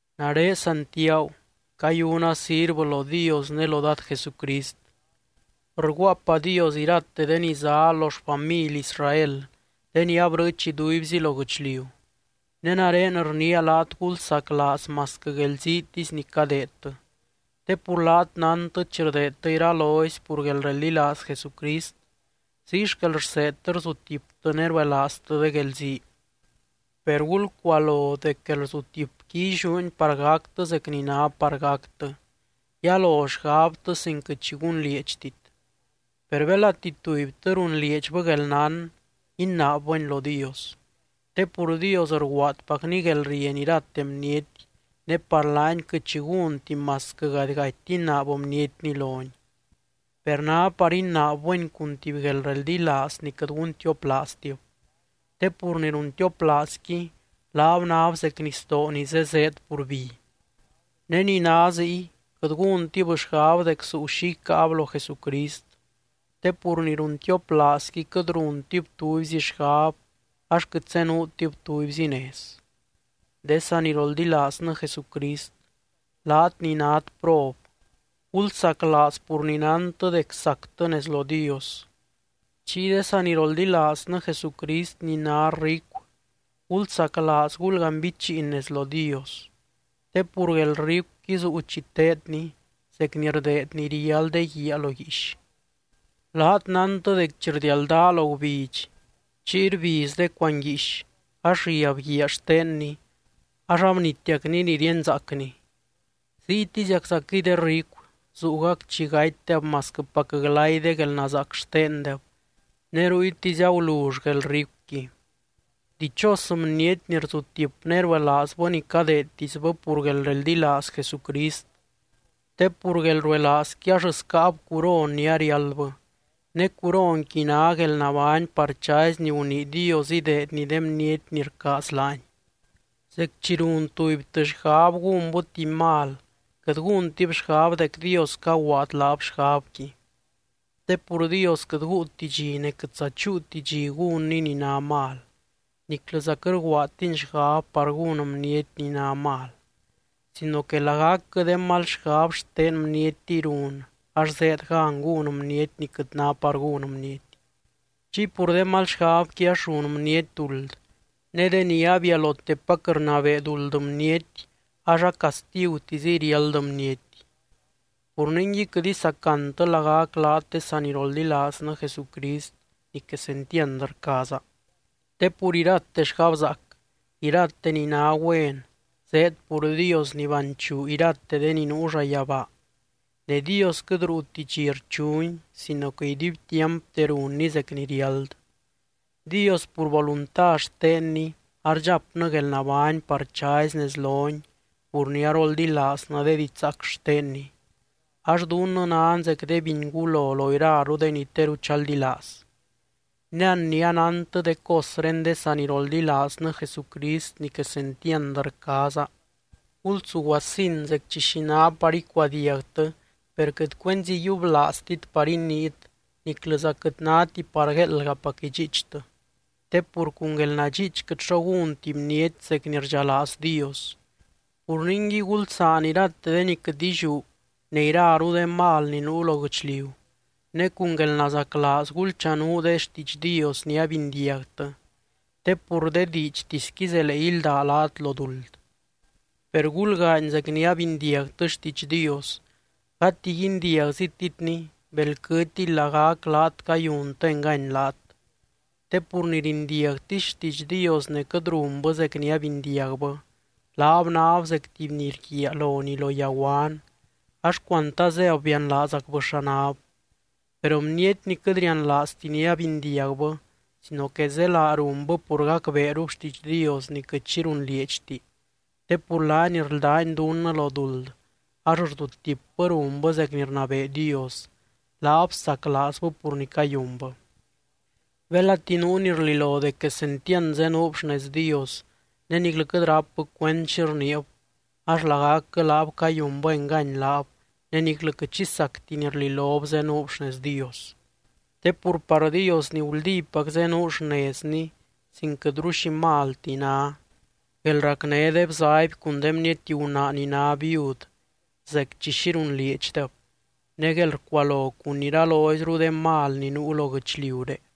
Nare Santiagu. Cayuna sirvɨ lo Dios ne lo Dad Jesucrist. Rguaapadios irate de ni zá lo xfamily Israel de ni abrɨɨch iduibzi lo guɨchliu. Ne nare rniia laat gulsaclaaz masquɨ guelziitisy ni cadeedtɨ. Te pur laat nántɨ chi rdeedtɨ iralozy pur guelreldilaaz Jesucrist, ziy xquel rseedtɨ rzutiptɨ ne ruelaaztɨ de guelzii. Per gulcualo dec guelrzutipqui illiúni par gactɨ zec ni ná par gactɨ, yalo xgabtɨ sin quɨt xi gunlieedxtit. Per belati tubytɨ runlieedxbɨ guelnán, inaabbɨni lo Dios. Te pur Dios rguaadpacny guelrieny irate bniety, ne par laany quɨt xi gúnti masquɨ gadigati inaab bnietni lony. Per ná par inaabbɨni cun tuby guelreldilaaz ni quɨt guntioplaaztib, te pur ni runtioplaazqui laab náb zec nisdoo ni zé zéed pur bi. Ne ni ná ziy, quɨt gúntib xgab dec zuu xi icáab lo Jesucrist, te pur ni runtioplaazqui quɨt runtib tubyzi xgab ax quɨt zenuutib tubyzi nez. De saniroldilaaznɨ Jesucrist, laat ni nát prob, gulsaclaaz pur ni nántɨ dec sactɨ nez lo Dios. Chiy de saniroldilaaznɨ Jesucrist ni ná ricu, gulsaclaaz gulganbichiin nez lo Dios. Te pur guelricuqui zuu chi teedni zec ni rdeed ni riál de guiaa lo guiix. Laat nántɨ dec chi rdialdaa lo gubidx chiy rbiz de cuanguiix ax riab guiaa xtenni ax abnitiacni ni ríenzaacni. Ziytiziaczaquɨy de ricu zuugac chi gatydeb masquɨpac glay de guelnazaac xtendeb ne ruytisy agulull guelricuqui. Dichos bniety ni rzutip ne ruelaazbɨ ni cadeedtisbɨ pur guelreldilaaz Jesucrist. Te pur guelruelaazqui ax scáab curon ni ariáldbɨ, ne curonqui ná guelnabány par chazy ni gunii Dios ideedny de bniety ni rcaaz laany. Zec chi run tubytɨ xgab gúnbɨ tuby mal, quɨt gúntib xgab dec Dios caguaad laab xgabqui, te pur Dios quɨt guuti dxi ne quɨtza chúuti dxi gúnny ni ná mal, niclɨza quɨt rguaadtiny xgab par gún bniety ni ná mal. Sino que lagacquɨ de mal xgab xte bnietiy run ax zéed gan gún bniety ni quɨt ná par gún bniety. Chiy pur de mal xgabqui ax run bniety duld ne deni abialotepac rnabee duld bniety ax acastigutiziy riáld bniety. Pur ningui quɨt isacantɨ lagac laat de saniroldilaaznɨ Jesucrist ni quesentiand rcaaza. Te pur irate xgabzaac, irate ni ná güen zéed pur Dios ni banchuu irate de ni nuu llayabaa, ne Dios quɨt ruuti dxi rchuny sino que iduibtiampte runny zec ni riáld. Dios pur volunta xtenny ardxapnɨ guelnabány par chazy nez lony pur ni aroldilaaznɨ de didxzaac xtenny, ax dunnɨ nan zec de bingúlo lo iraru de ni teru chaldilaaz. Ne an ni anántɨ de cosré de saniroldilaaznɨ Jesucrist ni quesentiand rcaaza, gulsuguasin zec chi xi ná par icuadiagtɨ per quɨt cuenzi yiublaaztit par iniit niclɨza quɨt náti par gueeldgapac idxiichtɨ. Te pur cun guelnadxiich quɨt xo gúnti bniety zec ni rdxalaaz Dios. Pur ningui gulsaan irate de ni quɨt illiú ne iraru de mal ni nuu lo guɨchliu, ne cun guelnazaclaaz gulchanuu de xtiidx Dios ni abindiagtɨ te pur de diidxtisqui zelee ílda laat lo duld. Per gulgaany zec ni abindiagtɨ xtiidx Dios, gati guindiagzititni bel quɨtiy lagac laat cayuntɨ engany laat. Te pur ni rindiagtisy xtiidx Dios ne quɨt runbɨ zec ni abindiagbɨ, laab náb zec tuby ni rguiaa lonii lo yaguan ax cuant azéb bianlaazacbɨ xa náb. Per bniety ni quɨt rianlaazti ni abindiagbɨ sino que zélaa runbɨ pur gacbeerub xtiidx Dios ni quɨt xi runlieedxti, te pur laany rldány dunnɨ lo duld ax rzutipbɨ runbɨ zec ni rnabee Dios, laab saclaazbɨ pur ni cayunbɨ. Belati nuu ni rlilo dec quesentiand zenuub xnez Dios ne niclɨ quɨt rápbɨ cuend xi rniib, ax lagacquɨ laab cayunbɨ engany laab ne niclɨ quɨt xi sacti ni rlilob zenuub xnez Dios. Te pur par Dios ni guldípac zenuu xnezny sin quɨtru xi malti, ná: guelracné de bzaby cun de bniety gunaa ni ná viud zec chi xi runlieedxdeb, ne guelrcualo cun iraloizru de mal ni nuu lo guɨchliuré.